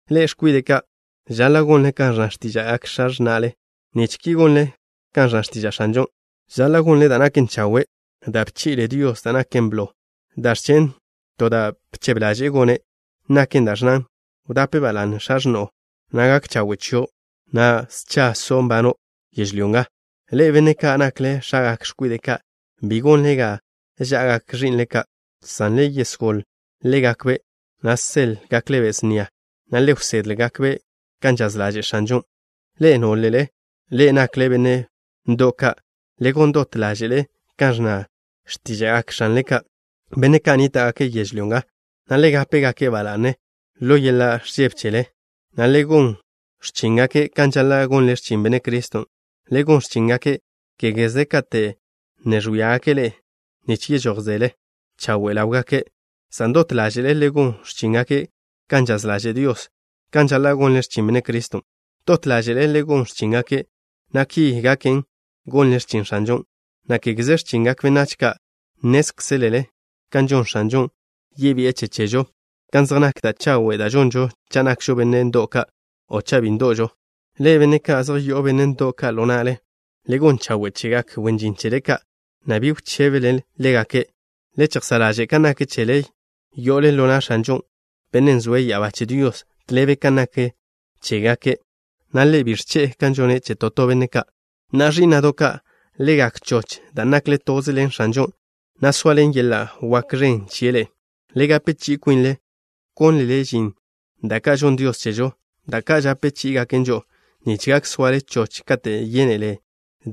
Ḻe'e, x̱kwide' ka', žaḻa' gonle kan ẕnna x̱tíža'gak x̱a x̱na'le nich ki gonle kan ẕnna x̱tiža' X̱anžon'. Žaḻa' gonle da' naken chawe'. Da' bchi'le Dios da' naken blo, dan' ẕchen' to da' bchebe ḻaže'e gone', naken da' ẕnnan: “Wdape ba la'ne x̱a x̱no'o, na' gak chawe' chio', na' scha so' nbano' yežlyó nga.” Ḻe'e, benne' ka' nakle x̱agak x̱kwide' ka', bi gonle ga ža'agak ẕi'nle ka', san le yesgól ḻégakbe', na' le seḻ-gakbe' snia, na' le wsedle-gakbe' kan žaz ḻaže' X̱anžon'. Ḻe'e, nólele ḻe'e nakle benne' ndo'w ka', le gon dot ḻáže'le kan ẕnna x̱tíža'gak x̱anle ka', benne' ka' nníta'gake' yežlyó nga, na' le gape-gake' ba la'ne ḻo yeḻa' ẕžebe chele, na' le gon x̱chíngake' kan žaḻa' gonle x̱chin Benne' Criston'. Le gon x̱chíngake', kégeze kate' ne ẕwíagake' ḻe'e, nich yežójzele chawe' ḻáwgake', san dot ḻáže'le le gon x̱chíngake' kan žaz ḻaže' Dios, kan žaḻa' gonle x̱chin Benne' Criston'. Dot ḻáže'le le gon x̱chíngake', na' ki gaken, gonle x̱chin X̱anžon', na' kégeze x̱chingak benách ka'. Nnézkzelele kan gon X̱anžon'. Yebi'e che chežo kan zej nak da' chawe' da' žonžo cha' nakžo benne' ndo'w ka', o cha' bi ndo'žo. Ḻe'e, benne' ka' zej yo'o benne' ndo'w ka' ḻo na'le, le gon chawe' chegak wen žin chele ka', na' bi wchébele ḻégake'. Le chejsá' ḻaže' kan nak chele, yo'ole ḻo na' X̱anžo, Bennen' zoe' ya'abá che Dios, tḻebe kan nak chégake', na' Ḻe' bi ẕche'e kan žone' che to to benne' ka'. Na'a, ẕí'na'do' ka', le gak choch dan' nakle toze ḻen X̱anžon', na' zoaḻen yeḻa' wak ẕen chie' ḻe'e. Le gape chi'i kwinle, wkónlele žin da' ka' žonn Dios chežo, da' ka' žape chí'igaken žo'o, nich gak soale choch katen' yénele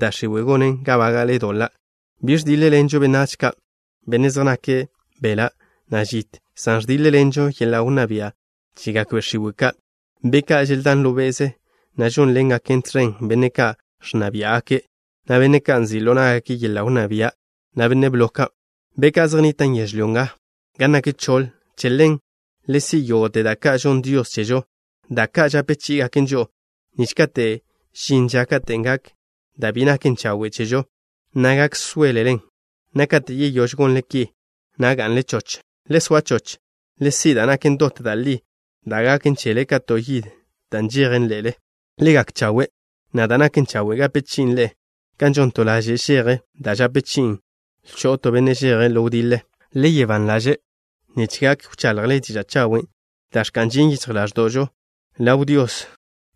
da' x̱iwe' gonen ga bága'le doḻa'. Bi ẕdíḻ-ḻenzežo benách ka', benne' zej nake' beḻa', na' žit, san ẕdíḻ-ḻenžo yeḻa' wnná bia' chegak be' x̱iwe' ka', be' ka' želdán ḻo be'ze, na' žónḻengaken tẕen benne' ka' ẕnna biá'gake', na' benne' ka' nzi' ḻo ná'gake' yeḻa' wnná bia', na' benne' blo ka', be' ka' zej nnitan' yežlyó nga gan nak choḻ. Che ḻen: Le si' yógo'te da' ka' žonn Dios chežo, da' ka' žape chí'igaken žo'o, nich kate' žin ža katen' gak da' bi naken chawe' chežo, na' gak sóelelen, na' kate' yeyóž gonle ki, na' ga'nle choch. Le soa choch. Le si' da' naken dot da' li, da' gaken chele ka to yid da' nžejen ḻe'le. Le gak chawe', na' da' naken chawe' gape chi'in ḻe'e kan žon to laže' žeje da' žape chi'in lcho'w to benne' žeje' ḻo wdiḻe. Le soa ban ḻaže' nich gak wchaḻjle diža' chawen' da' ẕka'n žin yichj ḻáẕdo'žo ḻaw Dios,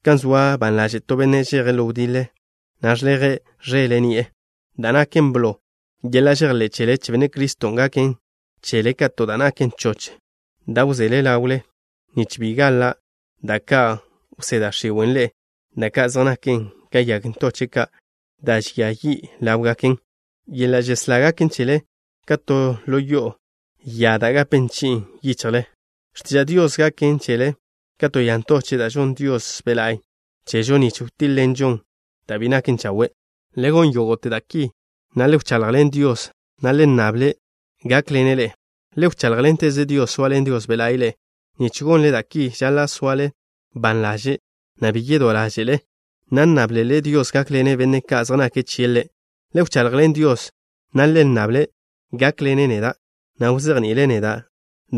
kan zoa ban ḻaže' to benne' žeje' ḻo wdiḻe, na' ẕleje' ẕele' ni'e. Da' naken blo, yeḻa' žejḻé' chele che Benne' Criston' gaken chele ka to da' naken choch da' wzele ḻawle, nich bi gaḻa' da' ka' wsé da' x̱iwe' ḻe'e, da' ka' zej naken ka yag ntóche'do' ka' da' žia yi' ḻáwe'gaken. Yeḻa' žeslá gaken chele ka to lo'o ya da' gape chi'in yichjle. X̱tiža' Dios gaken chele ka to ya ntoche' da' žonn Dios Be' la'y chežo, nich wtíḻ-ḻenžon da' bi naken chawe'. Le gon yógo'te da' ki, na' le wchaḻjḻen Dios, na' le nnable-ne' gákḻene' ḻe'e. Le wcháḻjḻenteze Dios, zoaḻen Dios Be' La'y ḻe'e. Nich gonle da' ki, žaḻa' soale ban ḻaže', na' bi yedó ḻáže'le, na' nnáblele Dios gákḻene' benne' ka' zej nake' chie' Ḻe'. Lewchaḻjḻen Dios, na' le nnable-ne' gákḻene' neda', na' wzejni'ile' neda'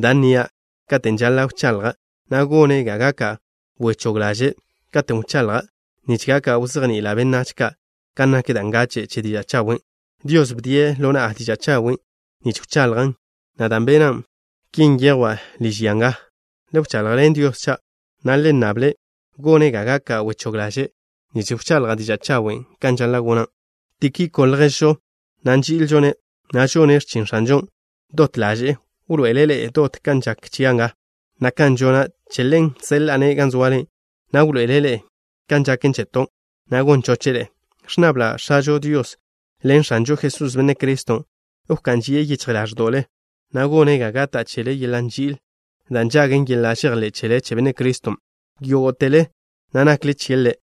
da' nnia' katen' žaḻa' wchaḻja', na' gone' ga gaka' wechóg ḻaže' katen' wchaḻja', nich gak wzejni'ila' benách ka' kan nak da' ngache' che diža' chawen'. Dios bdie' ḻo na'a diža' chawen' nich wchaḻjan', na' dan' bena' ki nyejwa' liž ya nga. Le wchaḻjḻen Dios cha', na' le nnable-ne' gone' ga gaka' wechóg ḻaže' nich wchaḻja' diža' chawen', kan žaḻa' gona'. Tíkiko, lježžo na' nži'ilžo-ne', na' žone' x̱chin X̱anžon' dot ḻaže'e, wḻoe'ele' ḻe'e dot kan žak chia' nga, na' kan žona'. Che ḻen, seḻa'a-ne' gan zoale, na' wḻoe'ele' ḻe'e kan žaken cheto', na' gon choche' ḻe'e. Ẕnnabla' X̱ažo Dios ḻen X̱anžo Jesús, Benne' Criston', wká'n žie' yichj ḻáẕdo'le, na' gone' ga gata' chele yeḻa' nži'il da' nžagen yeḻa' žejḻé' chele che Benne' Criston', yógo'tele na' nakle chie' Ḻe'.